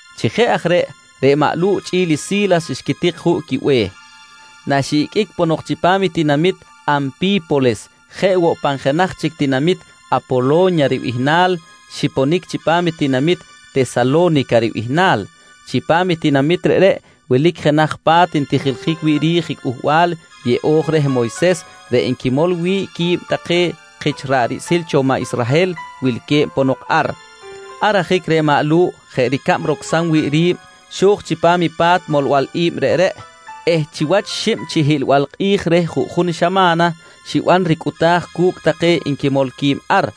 Chi jeꞌ aj reꞌ, reꞌ maꞌ Lu̱ꞌ chꞌi̱l i Si̱las xquitik juꞌ quibe̱h. Naxiꞌiqꞌuic ponok chipam i tinamit Anpi̱polis jeꞌ woꞌ pan jenaj chic tinamit Apolo̱nya ribihnal, xiponic chipam tinamit Tesalo̱nica ribihnal. Chipam i tinamit reꞌreꞌ wilic jenaj pa̱t ntijiljic wi̱ꞌ ri̱j Cꞌuhbal Yeꞌo̱j reh Moyses reꞌ nquimol wi̱ꞌ qui̱b take kich ra̱ꞌ riꞌsil cho maꞌ Israhel wilque̱b ponok ar. Ar ajic reꞌ maꞌ Lu̱ꞌ jeꞌ ricab rocsam wi̱ꞌ ri̱b, xo̱j chipam i pa̱t molbal i̱b reꞌreꞌ eh chiwach xib chi hiꞌlbal kꞌi̱j reh juꞌjun xama̱na, xiban ricꞌuta̱j cu̱cꞌ take nquimol qui̱b ar.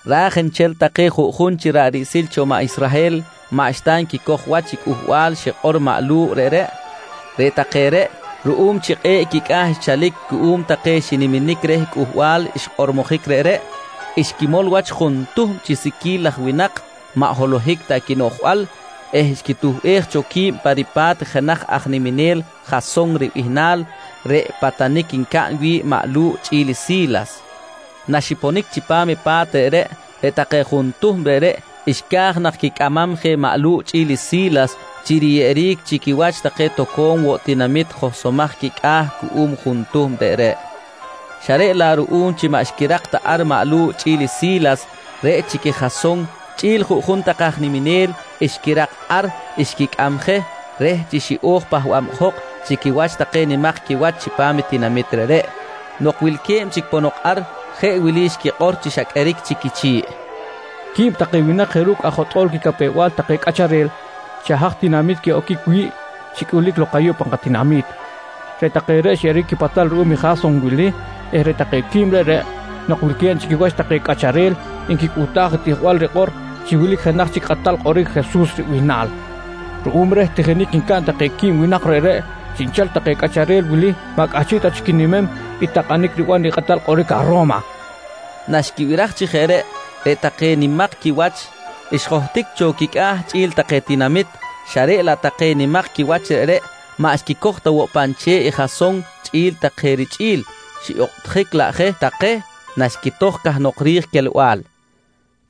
Raj nchel take juꞌjun chic ra̱ꞌ riꞌsil cho maꞌ Israhel maꞌxta nquicoj wach i cꞌuhbal xikꞌor maꞌ Lu̱ꞌ reꞌreꞌ. Reꞌ take reꞌ, ruꞌum chi kꞌe̱ꞌ quicꞌa̱ xchalic cuꞌum queh take xiniminic reh cꞌuhbal xkꞌormojic reꞌreꞌ, xquimol wach juntuhm chi siqui̱l laj winak maꞌ holohic ta quinoꞌjbal eh xquituhbej cho qui̱b pa ripa̱t jenaj aj niminel Jason ribihnal reꞌ patanic ncaꞌn wi̱ꞌ maꞌ Lu̱ꞌ chꞌi̱l i Si̱las. Naxiponic chipam i pa̱t reꞌreꞌ, reꞌ take juntuhm reꞌreꞌ xca̱j nak quicꞌamam je maꞌ Lu̱ꞌ chꞌi̱l i Si̱las chi riyeꞌeric chi quiwach take toco̱m woꞌ tinamit johsomaj quicꞌa̱ cuꞌum juntuhm reꞌreꞌ xa reꞌ laꞌ ruꞌum chi maꞌ xquirak ta ar maꞌ Lu̱ꞌ chꞌi̱l i Si̱las, reꞌ chic i Jason chꞌi̱l juꞌjun take aj niminel xquirak ar xquicꞌam je reh chi xiꞌo̱j pahbabjok chi quiwach take nimak quiwach chipam i tinamit reꞌreꞌ. Nok wilque̱b chic ponok ar, jeꞌ wili xquikꞌor chi xa qꞌueric chic quichi̱ꞌ: «Qui̱b take winak jeꞌ ru̱cꞌ aj jotꞌo̱l quicapew-bal take cꞌacharel xa haj tinamit quiꞌoquic wi̱ꞌ, xicꞌulic lok ayuꞌ pan katinami̱t. Reꞌ take reꞌ xyeꞌeric quipatal ruꞌum i Jason wili eh reꞌ take quib reꞌreꞌ nok wilque̱b chi quiwach take cꞌacharel, nquicꞌuhtaj i tijbal rikꞌor chi wilic jenaj chic kꞌatal kꞌoric Jesus ribihnal. Ruꞌum reh tijinic ncaꞌn take quib winak reꞌreꞌ, chiꞌnchel take cꞌacharel wili maꞌ cꞌahchiꞌ ta chic quinimem i takꞌanic riban i kꞌatal kꞌoric aj Ro̱ma, nqui take. Naxquibiraj chi jeꞌ reꞌ, reꞌ take nimak quiwach xjohtic cho quicꞌa̱ chꞌi̱l take tinamit xa reꞌ laꞌ take nimak quiwach reꞌreꞌ maꞌ xquicoj ta woꞌ pan che̱ꞌ i Jason chꞌi̱l take richꞌi̱l, xiꞌokꞌtjic laꞌ je take naxquitoj cahnok ri̱j quelbal je.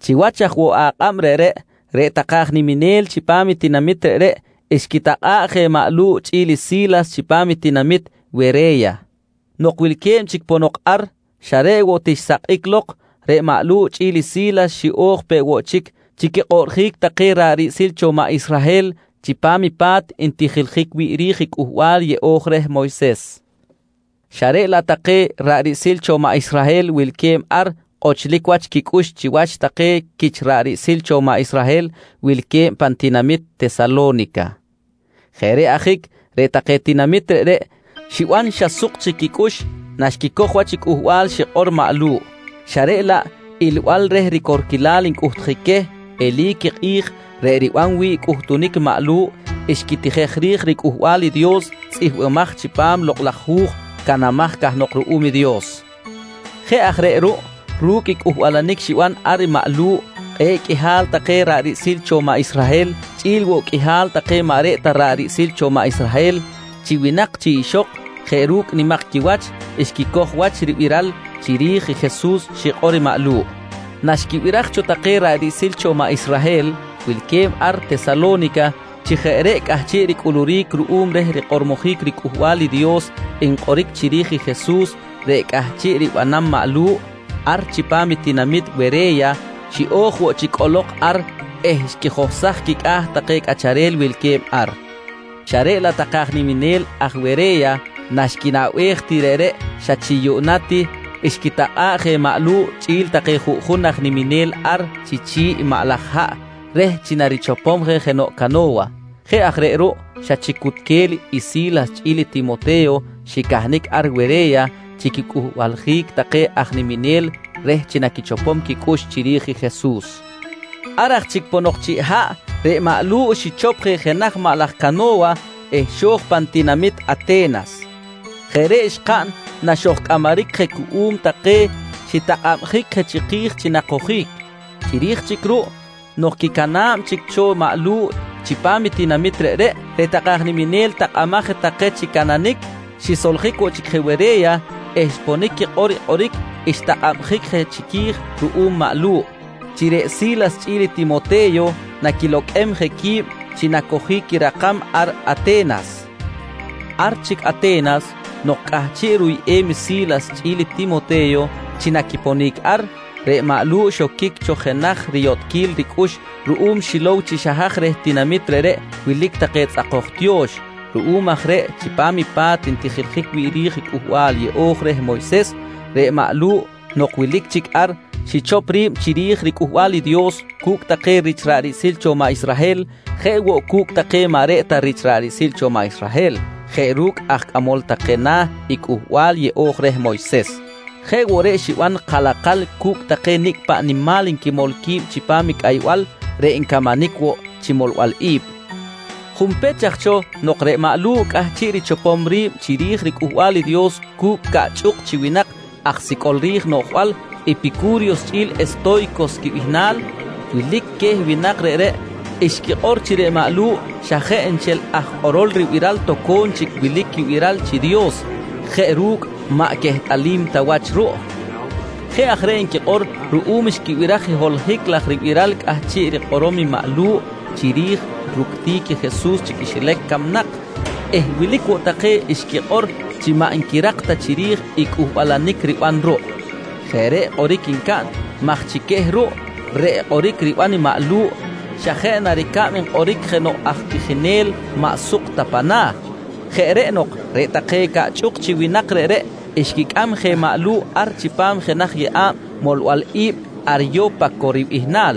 Chiwach aj woꞌ akꞌab reꞌreꞌ, reꞌ take aj niminel chipam i tinamit reꞌreꞌ, xquitakꞌa̱ꞌ je maꞌ Lu̱ꞌ chꞌi̱l i Si̱las chipam i tinamit Were̱ya. Nok wilque̱b chic ponok ar xa reꞌ woꞌ ti xisakꞌic lok, reꞌ maꞌ Lu̱ꞌ chꞌi̱l i Si̱las xiꞌo̱j peꞌ woꞌ chic chi quikꞌoꞌrjic take ra̱ꞌ riꞌsil cho maꞌ Israhel chipam i pa̱t ntijiljic wi̱ꞌ ri̱j i Cꞌuhbal Yeꞌo̱j reh Moyses xa reꞌ laꞌ take ra̱ꞌ riꞌsil cho maꞌ Israhel wilque̱b ar kꞌochlic wach quicꞌux chiwach take quich ra̱ꞌ riꞌsil cho maꞌ Israhel wilque̱b pan tinamit Tesalo̱nica. Jeꞌ reꞌ ajic reꞌ take tinamit reꞌreꞌ xiban xa suk chic quicꞌux naxquicoj wach i cꞌuhbal xikꞌor maꞌ Lu̱ꞌ, xa reꞌ laꞌ ilbal reh ricorquilal ncꞌuhtjic queh, eli̱c i kꞌi̱j reꞌ riban wi̱ꞌ cꞌuhtunic maꞌ Lu̱ꞌ xquitijej ri̱j riCꞌuhbal i Dios tzꞌihmbimaj chipam i Lokꞌ laj Hu̱j canamaj cahnok ruꞌum i Dios. Jeꞌ aj reꞌ ruꞌ ru̱cꞌ i cꞌuhbalanic xiban ar i maꞌ Lu̱ꞌ, kꞌe̱ꞌ qꞌuihal take ra̱ꞌ riꞌsil cho maꞌ Israhel chꞌi̱l woꞌ qꞌuihal take maꞌ reꞌ ta ra̱ꞌ riꞌsil cho maꞌ Israhel chi winak chi ixok jeꞌ ru̱cꞌ nimak quiwach, xquicoj wach i ribiral chiri̱j i Jesus xikꞌor i maꞌ Lu̱ꞌ. Naxquibiraj cho take ra̱ꞌ riꞌsil cho maꞌ Israhel wilque̱b ar Tesalo̱nica chi jeꞌ reꞌ cꞌahchiꞌ ricꞌuluric ruꞌum reh rikꞌormojic riCꞌuhbal i Dios nkꞌoric chiri̱j i Jesus reꞌ cꞌahchiꞌ ribanam maꞌ Lu̱ꞌ ar chipam i tinamit Were̱ya, xiꞌo̱j woꞌ chic cꞌolok ar eh xquijohsaj quicꞌa̱ take cꞌacharel wilque̱b ar xa reꞌ laꞌ take aj niminel ar Were̱ya naxquinaꞌbej ti reꞌreꞌ, xa chi yuꞌna ti xquitakꞌa̱ꞌ je maꞌ Lu̱ꞌ chꞌi̱l take juꞌjun aj niminel ar chi chi̱ꞌ i maꞌ laj haꞌ reh chi narichopom je jenoꞌ cano̱wa. Jeꞌ aj reꞌ ruꞌ, xa chic cutquel i Si̱las chꞌi̱l Timote̱yo xicahnic ar Were̱ya chi quicꞌuhbaljic take aj niminel reh chi naquichopom quicꞌux chiri̱j i Jesus. Ar aj chic ponok chiꞌ haꞌ, reꞌ maꞌ Lu̱ꞌ xichop je jenaj maꞌ laj cano̱wa eh xo̱j pan tinamit Ate̱nas. Jeꞌ reꞌ xkaꞌn naxojcꞌamaric je cuꞌum take xitakꞌabjic je chiki̱j chi nakojic. Chiri̱j chic ruꞌ nok quicana̱b chic cho maꞌ Lu̱ꞌ chipam i tinamit reꞌreꞌ, reꞌ take aj niminel takꞌamaj je take chi cananic, xisoljic woꞌ chic je Were̱ya eh xponic quikꞌor i kꞌoric xtakꞌabjic je chiqui̱j ruꞌum maꞌ Lu̱ꞌ, chi reꞌ Si̱las chꞌi̱l i Timote̱yo naquiloqꞌuem je qui̱b chi nacojic quirakam ar Ate̱nas. Ar chic Ate̱nas nok cꞌahchiꞌ ruyꞌem i Si̱las chꞌi̱l i Timote̱yo chi naquiponic ar, reꞌ maꞌ Lu̱ꞌ xoquic cho jenaj riyotꞌquil ricꞌux ruꞌum xilow chi xa haj reh tinamit reꞌreꞌ wilic take tzꞌakoj tiyo̱x. Ruꞌum aj reꞌ chipam i pa̱t ntijiljic wi̱ꞌ ri̱j Cꞌuhbal Yeꞌo̱j reh Moyses, reꞌ maꞌ Lu̱ꞌ nok wilic chic ar, xichop ri̱b chiri̱j riCꞌuhbal i Dios cu̱cꞌ take rich ra̱ꞌ riꞌsil cho maꞌ Israhel jeꞌ woꞌ cu̱cꞌ take maꞌ reꞌ ta take ra̱ꞌ riꞌsil cho maꞌ Israhel jeꞌ ru̱cꞌ aj cꞌamol take na̱ i Cꞌuhbal Yeꞌo̱j reh Moyses. Jeꞌ woꞌ reꞌ xiban kalakal cu̱cꞌ take nicꞌ paꞌ nimal nquimol qui̱b chipam i cꞌaybal reꞌ ncamanic woꞌ chi molbal i̱b. Junpech aj cho nok reꞌ maꞌ Lu̱ꞌ cꞌahchiꞌ richopom ri̱b chiri̱j riCꞌuhbal i Dios cu̱cꞌ caꞌchꞌuk chi winak aj sicꞌol ri̱j noꞌjbal, Epicu̱ryos chꞌi̱l Esto̱ycos quibihnal, wilic queh winak reꞌreꞌ xquikꞌor chi reꞌ maꞌ Lu̱ꞌ xa jeꞌ nchel aj kꞌorol ribiral toco̱m chic wilic quibiral chi dios jeꞌ ru̱cꞌ maꞌ quehtꞌalim ta wach ruꞌ. Jeꞌ aj reꞌ nquikꞌor ruꞌum xquibiraj i holohic laj ribiral cꞌahchiꞌ rikꞌorom i maꞌ Lu̱ꞌ chiri̱j ructic i Jesus chi quixilac camnak eh wilic woꞌ take xquikꞌor chi maꞌ nquirak ta chiri̱j i cꞌuhbalanic riban ruꞌ. Jeꞌ reꞌ kꞌoric ncaꞌn maj chi queh ruꞌ reꞌ kꞌoric riban i maꞌ Lu̱ꞌ xa jeꞌ na ricab nkꞌoric jenoꞌ aj tijinel maꞌ suk ta pa̱m na̱. Jeꞌ reꞌ nok reꞌ take caꞌchꞌuk chi winak reꞌreꞌ xquicꞌam je maꞌ Lu̱ꞌ ar chipam jenaj yeꞌa̱b molbal i̱b “Aryo̱paco” ribihnal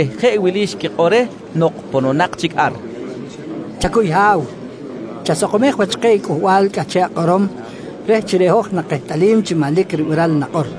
eh jeꞌ wili xquikꞌor reh nok pononak chic ar: «Chacuy Ha̱w, chasakomej wach keh i cꞌuhbal cꞌahchiꞌ akꞌorom reh chi reꞌ hoj nakehtꞌalim chi manlic ribiral i nakꞌor.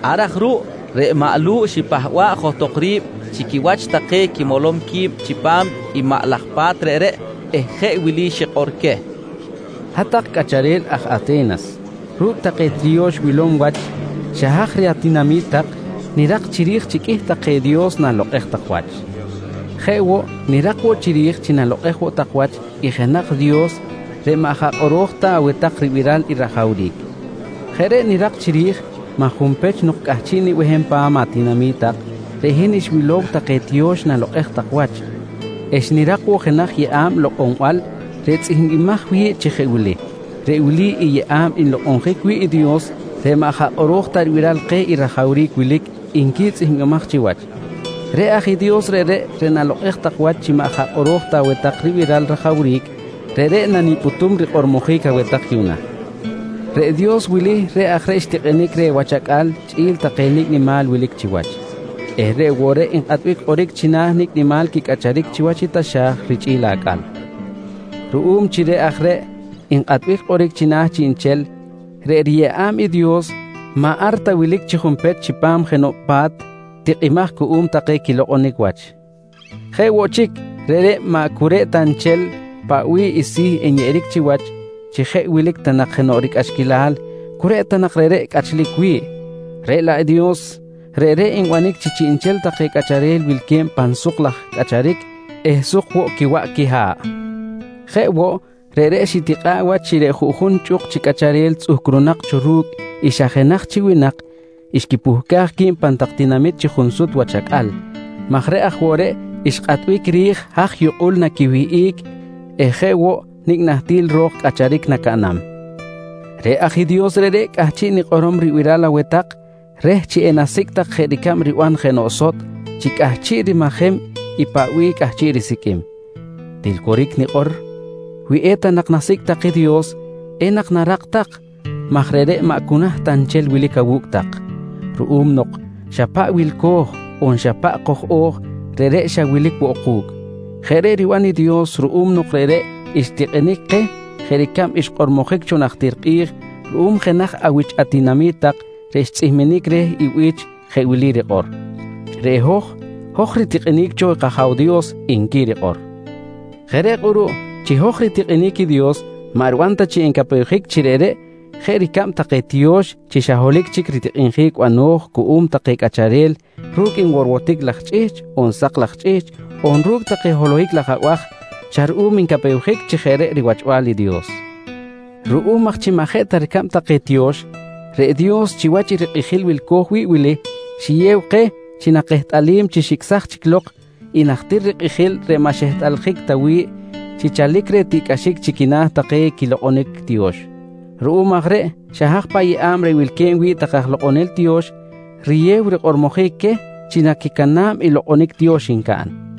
Ar aj ruꞌ reꞌ maꞌ Lu̱ꞌ xipahba̱ꞌ johtok ri̱b chi quiwach take quimolom qui̱b chipam maꞌ laj pa̱t reꞌreꞌ eh jeꞌ wili xikꞌor queh: «Hat-tak cꞌacharel aj Ate̱nas, ru̱cꞌ take tiyo̱x wilom wach xa haj reh atinami̱t tak nirak chiri̱j chi qꞌuih take dios nalokꞌej tak wach. Jeꞌ woꞌ nirak woꞌ chiri̱j chi nalokꞌej woꞌ tak wach i jenaj Dios reꞌ maꞌ jaꞌ kꞌoro̱j ta aweh tak ribiral i rajawric. Jeꞌ reꞌ nirak chiri̱j maj junpech nok cꞌahchiꞌ nibehem pan atinami̱t tak, reꞌ hin xwilow take tiyo̱x nalokꞌej tak wach eh xnirak woꞌ jenaj yeꞌa̱b lokꞌonbal reꞌ tzꞌihmbimaj wi̱ꞌ chi jeꞌ wili: ‹Reꞌ wili yeꞌa̱b nlokꞌonjic wi̱ꞌ i Dios reꞌ maꞌ jaꞌ kꞌoro̱j ta ribiral keh i rajawric wilic, nqui tzꞌihmbimaj chiwach. «Reꞌ aj i Dios reꞌreꞌ, reꞌ nalokꞌej tak wach chi maꞌ jaꞌ kꞌoro̱j ta aweh tak ribiral rajawric, reꞌreꞌ nanipꞌutum rikꞌormojic aweh tak yuꞌna: Reꞌ Dios wili reꞌ aj reꞌ xtikꞌinic reh wach acꞌal chꞌi̱l take nicꞌ nimal wilic chiwach eh reꞌ woꞌ reꞌ nkꞌatbic kꞌoric china̱ nicꞌ nimal quicꞌacharic chiwach i taxa̱j richꞌi̱l acꞌal. «Ruꞌum chi reꞌ aj reꞌ nkꞌatbic kꞌoric china̱ chiꞌnchel, reꞌ riyeꞌa̱b i Dios maꞌ ar ta wilic junpech chipam jenoꞌ pa̱t tikꞌimaj cuꞌum take quilokꞌonic wach. Jeꞌ woꞌ chic, reꞌreꞌ maꞌ cu reꞌ ta nchel paꞌ bih i si̱ nyeꞌeric chiwach chi jeꞌ wilic ta nak jenoꞌ ricꞌaxquilal, cu reꞌ ta nak reꞌreꞌ cꞌachlic wi̱ꞌ. Reꞌ laꞌ Dios, reꞌreꞌ nbanic chi chiꞌnchel take cꞌacharel wilque̱b pan suk laj cꞌacharic eh suk woꞌ quiwaꞌ quiha̱ꞌ. Jeꞌ woꞌ, reꞌreꞌ xitikꞌa̱ꞌ wach chi reꞌ juꞌjun chꞌuk chi cꞌacharel tzꞌuhcrunak cho ru̱cꞌ i xa jenaj chi winak, xquipuhcaj qui̱b pan tak tinamit chi junsut wach acꞌal maj reꞌ aj woꞌ reꞌ xkꞌatbic ri̱j haj yukꞌul naquiwihꞌic eh jeꞌ woꞌ nicꞌ nahtil ro̱k cꞌacharic nacaꞌnam. «Reꞌ aj i Dios reꞌreꞌ, cꞌahchiꞌ nikꞌorom ribiral aweh tak reh chi enasicꞌ tak jeꞌ ricab riban jenoꞌ sotꞌ chi cꞌahchiꞌ rimajem i paꞌ bih cꞌahchiꞌ risiqꞌuim. Til coric nikꞌor, wi eta nak nasicꞌ tak i Dios, enak narak tak maj reꞌreꞌ maꞌ cu naht ta nchel wilic awu̱cꞌ tak ruꞌum nok xa paꞌ wilco̱j on xa paꞌ koj-o̱j, reꞌreꞌ xa wilic woꞌ ku̱cꞌ. Jeꞌ reꞌ riban i Dios ruꞌum nok reꞌreꞌ xtikꞌinic keh jeꞌ ricab xkꞌormojic cho najtir kꞌi̱j ruꞌum jenaj awich atinami̱t tak reꞌ xtzꞌihminic reh i bi̱ch jeꞌ wili rikꞌor: ‹Reꞌ hoj, hoj ritikꞌinic cho kAja̱w Dios, nqui rikꞌor. «Jeꞌ reꞌ kꞌuruꞌ chi hoj ritikꞌinic i Dios maꞌ riban ta chi encapewjic chi reꞌreꞌ jeꞌ ricab take tiyo̱x chi xa holohic chic ritikꞌinjic bano̱j cuꞌum take cꞌacharel ru̱cꞌ nworwotic laj chꞌihchꞌ on sak laj chꞌihchꞌ on ru̱cꞌ take holohic laj abaj, xa ruꞌum ncapewjic chi jeꞌ reꞌ riwachbal i Dios. «Ruꞌum aj chi maꞌ jeꞌ ta ricab take tiyo̱x, reꞌ Dios chiwach i rikꞌijil wilco̱j wi̱ꞌ wili, xiyew keh chi nakehtꞌalim chi xicꞌsaj chic lok i najtir rikꞌijil reꞌ maꞌ xehtꞌaljic ta wi̱ꞌ chi chalic reh tiꞌcꞌaxic chi quina̱ take quilokꞌonic tiyo̱x. Ruꞌum aj reꞌ xa haj paꞌ yeꞌa̱b reꞌ wilque̱b wi̱ꞌ take aj lokꞌonel tiyo̱x, riyew rikꞌormojic queh chi naquicana̱b i lokꞌonic tiyo̱x ncaꞌn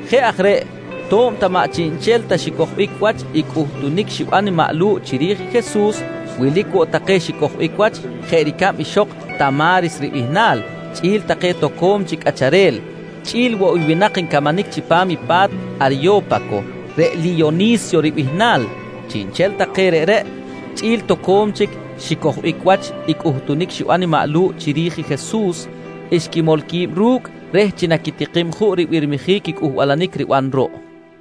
Jeꞌ aj reꞌ to̱b ta maꞌ chiꞌnchel ta xicojbic wach i cꞌuhtunic xiban maꞌ Lu̱ꞌ chiri̱j i Jesus, wilic woꞌ take xicojbic wach jeꞌ ricab ixok Ta̱maris ribihnal chꞌi̱l take toco̱m chic cꞌacharel, chꞌi̱l woꞌ i winak ncamanic chipam i pa̱t Aryo̱paco, reꞌ Liyoni̱syo ribihnal. Chiꞌnchel take reꞌreꞌ chꞌi̱l toco̱m chic xicojbic woꞌ wach i cꞌuhtunic xiban i maꞌ Lu̱ꞌ chiri̱j i Jesus, xquimol qui̱b ru̱cꞌ reh chi naquitikim juꞌ ribirmijic i cꞌuhbalanic riban ruꞌ.